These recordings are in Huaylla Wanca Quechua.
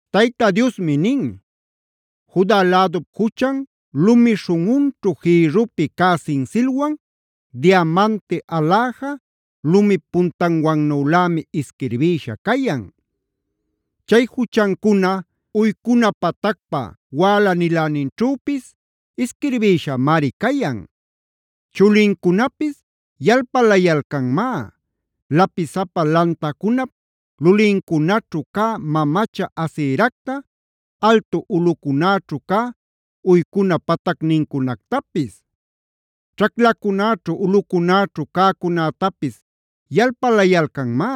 Tayta Diosmi nin: “Juda lädup juchan lumi śhunꞌunćhu jïrrupi cä sinsilwan, diamante aläja lumip puntanwannülämi isquirbïsha cayan. Chay juchancuna uycuna patacpa wäla-niläninćhüpis isquirbïshamari cayan. Chulincunapis yalpalayalcanmá lapisapa lantacunap lulincunaćhu cä mamacha Aseracta, altu ulꞌucunäćhu cä uycuna patacnincunactapis. Ćhaclacunäćhu ulꞌucunäćhu cäcunätapis yalpalayalcanmá.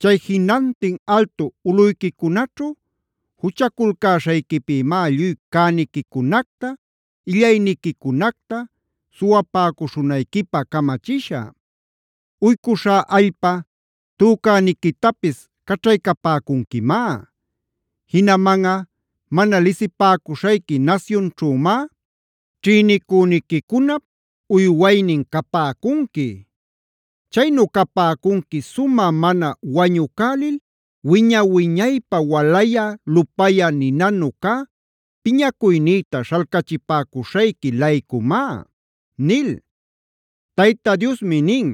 Chay jinantin altu ulꞌuyquicunaćhu juchaculcäśhayquipïmá lluy cäniquicunacta, illayniquicunacta suwapäcuśhunayquipä camachishä. Uycuśhá allpa tücäniquitapis caćhaycapäcunquimá. Jinamanꞌa mana lisipäcuśhayqui nasyunćhümá ćhïnicüniquicunap uywaynin capäcunqui. Chaynu capäcunqui sumä mana wañucälil wiña-wiñaypä walayä lupayä ninanu cä piñacuynïta śhalcachipäcuśhayqui-laycumá” nil. Tayta Diosmi nin: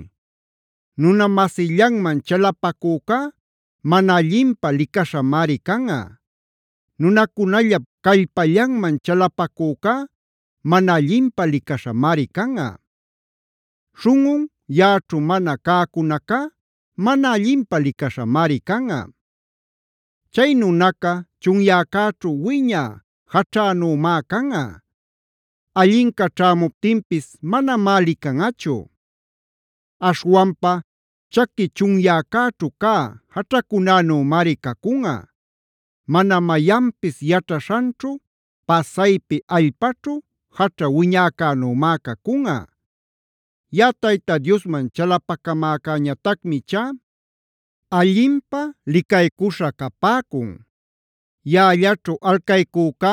“Nuna-masillanman chalapacücá mana allinpä licaśhamari canꞌa. Nunacunallap callpallanman chalapacücá mana allinpä licaśhamari canꞌa. Śhunꞌun yaꞌaćhu mana cäcunacá mana allinpä licaśhamari canꞌa. Chay nunaca chunyäcäćhu wiñä jaćhanümá canꞌa. Allinca ćhämuptinpis manamá licanꞌachu. Aśhwanpa chaqui chunyäcäćhu cä jaćhacunänümari cacunꞌa; mana mayanpis yaćhaśhanćhu pasaypi allpaćhu jaćha wiñäcänümá cacunꞌa. “Yaꞌa Tayta Diosman chalapacamäcäñatacmi ichá allinpä licaycuśha capäcun; yaꞌallaćhu alcaycücá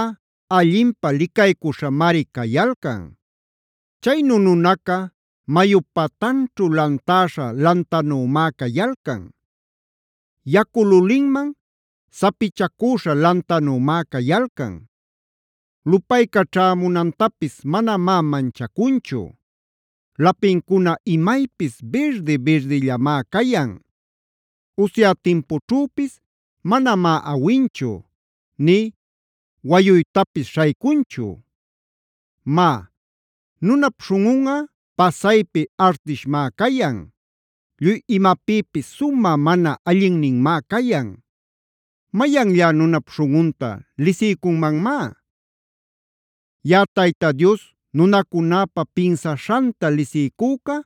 allinpä licaycuśhamari cayalcan. Chaynu nunaca mayup patanćhu lantäśha lantanümá cayalcan. Yacu lulinman sapichacüśha lantanümá cayalcan.a Lupayca ćhämunantapis manamá manchacunchu. Lapincuna imaypis birdi-birdillamá cayan. Usya timpućhüpis manamá awinchu nï wayuytapis śhaycunchu. “Má, nunap śhunꞌunꞌa pasaypi artishmá cayan; lluy imapïpis sumä mana allinninmá cayan. ¿Mayanllá nunap śhunꞌunta lisiycunmanmá? Yaꞌa Tayta Dios nunacunäpa pinsaśhanta lisiycüca,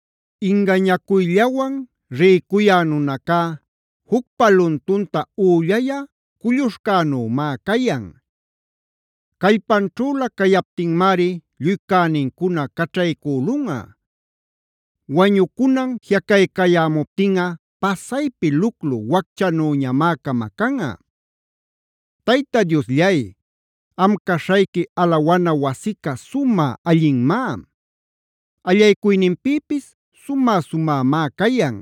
Ingañacuyllawan rïcuyä nunacá, jucpa luntunta üllayä culluśhcänümá cayan. Callpanćhülä cayaptinmari lluy cänincuna caćhaycülunꞌa; wañucunan jiꞌacaycayämuptinꞌa pasaypi luclu wacchanüñamá camacanꞌa. Tayta Diosllay, am caśhayqui alawana wasica sumä allinmá. Allaycuyninpïpis sumä-sumämá cayan.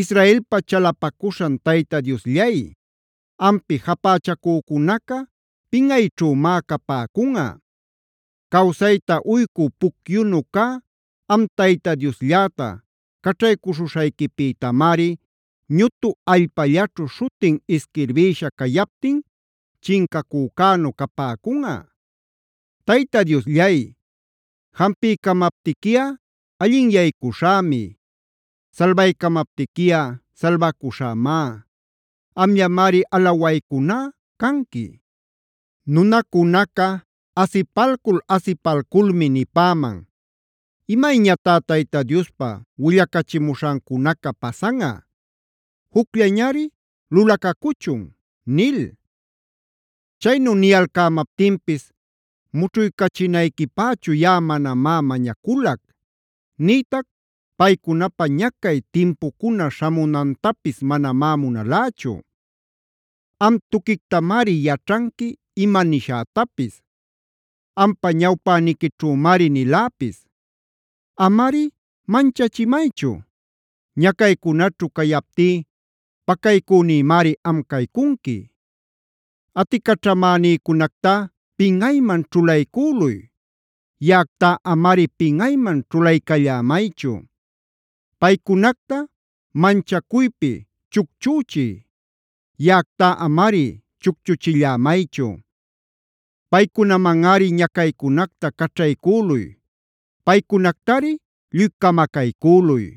Israelpa chalapacuśhan Tayta Diosllay, ampi japächacücunaca pinꞌayćhümá capäcunꞌa. Cawsayta uycü pucyunu cä, am Tayta Dioslläta caćhaycuśhuśhayquipïtamari ñutu allpallaćhu śhutin isquirbïsha cayaptin chincacücänu capäcunꞌa. Tayta Diosllay, jampiycamaptiquiꞌa allinyaycuśhämi. Salbaycamaptiquiꞌa salbacuśhämá. Amllamari alawaycuná canqui. Nunacunaca asipalcul-asipalculmi nipäman: “¿Imayñatá Tayta Diospa willacachimuśhancunaca pasanꞌa? Jucllañari lulacacuchun” nil. Chaynu niyalcämaptinpis mućhuycachinayquipächu yaꞌa manamá mañaculac. Nïtac paycunapä ñacay timpucuna śhamunantapis manamá munalächu. Am tuquictamari yaćhanqui ima nishätapis; ampa ñawpäniquićhümari niläpis. Amari manchachimaychu. Ñacaycunaćhu cayaptí pacaycünïmari am caycunqui. Aticaćhamänïcunactá pinꞌayman ćhulaycüluy. Yaꞌactá amari pinꞌayman ćhulaycallämaychu; paycunacta manchacuypi chucchüchiy; yaꞌactá amari chucchuchillämaychu. Paycunamanꞌari ñacaycunacta caćhaycüluy; paycunactari lluy camacaycüluy.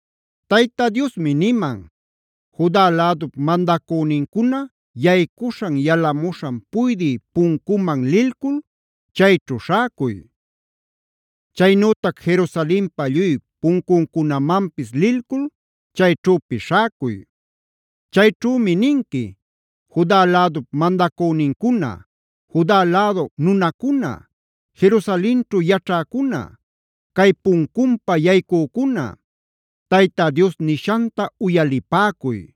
Tayta Diosmi niman: “Juda lädup mandacünincuna yaycuśhan yalamuśhan puydï puncuman lilcul chayćhu śhäcuy. Chaynütac Jerusalenpa lluy puncuncunamanpis lilcul chayćhüpis śhäcuy. Chayćhümi ninqui: ‘Juda lädup mandacünincuna, Juda lädu nunacuna, Jerusalenćhu yaćhäcuna, cay puncunpa yaycücuna, Tayta Dios nishanta uyalipäcuy.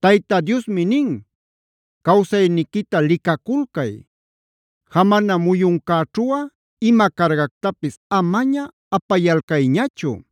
Tayta Diosmi nin: Cawsayniquita licaculcay. Jamana muyuncäćhuꞌa ima cargactapis amaña apayalcayñachu;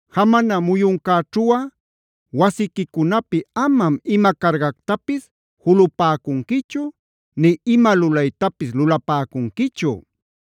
Jamana muyuncäćhuꞌa wasiquicunapi amam ima cargactapis julupäcunquichu nï ima lulaytapis lulapäcunquichu.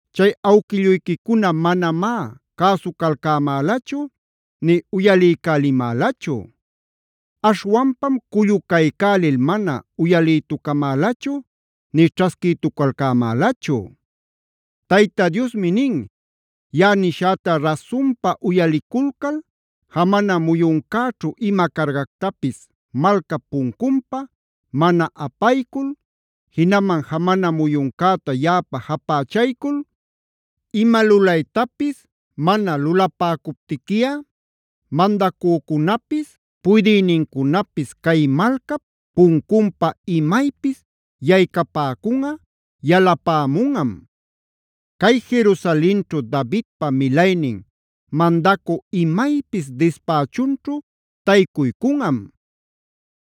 Chay awquilluyquicuna manamá cäsucalcämälachu nï uyaliycälimälachu. Aśhwanpam cullucaycälil mana uyalïtucamälachu nï ćhasquïtucalcämälachu. “ ‘Tayta Diosmi nin: Yaꞌa nishäta rasunpa uyaliculcal, jamana muyuncäćhu ima cargactapis malcap puncunpa mana apaycul, jinaman jamana muyuncäta yaꞌapä japächaycul ima lulaytapis mana lulapäcuptiquiꞌa, mandacücunapis puydïnincunapis cay malcap puncunpa imaypis yaycapäcunꞌa yalapämunꞌam. Cay Jerusalenćhu Davidpa milaynin mandacü imaypis dispächunćhu taycuycunꞌam.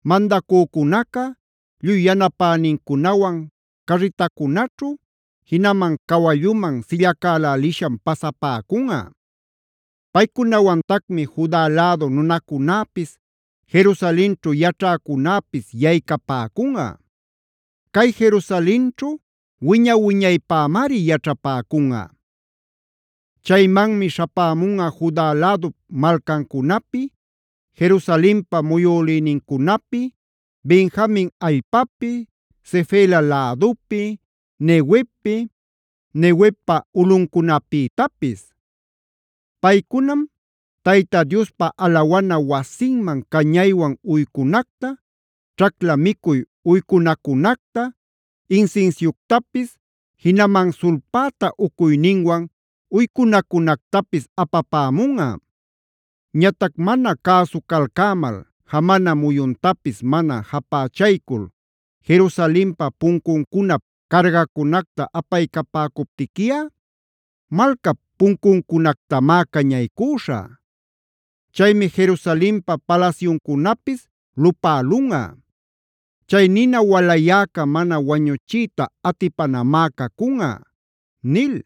Mandacücunaca lluy yanapänincunawan carritacunaćhu jinaman cawalluman sillacälälisham pasapäcunꞌa. Paycunawantacmi Juda lädu nunacunäpis, Jerusalenćhu yaćhäcunäpis yaycapäcunꞌa. Cay Jerusalenćhu wiña-wiñaypämari yaćhapäcunꞌa. Chaymanmi śhapämunꞌa Juda lädup malcancunapi, Jerusalenpa muyülïnincunapi, Benjamin allpapi, Sefela lädupi, Neguevpi, Neguevpa ulꞌuncunapïtapis. Paycunam Tayta Diospa alawana wasinman cañaywan uycunacta, ćhacla micuy uycunacunacta, insinsiuctapis jinaman sulpäta ucuyninwan uycunacunactapis apapämunꞌa. Ñatac mana cäsucalcämal, jamana muyuntapis mana japächaycul Jerusalenpa puncuncunap cargacunacta apaycapäcuptiquiꞌa malcap puncuncunactamá cañaycüśhä. Chaymi Jerusalenpa palasyuncunapis lupälunꞌa. Chay nina walayäca mana wañuchiyta atipanamá cacunꞌa’” nil.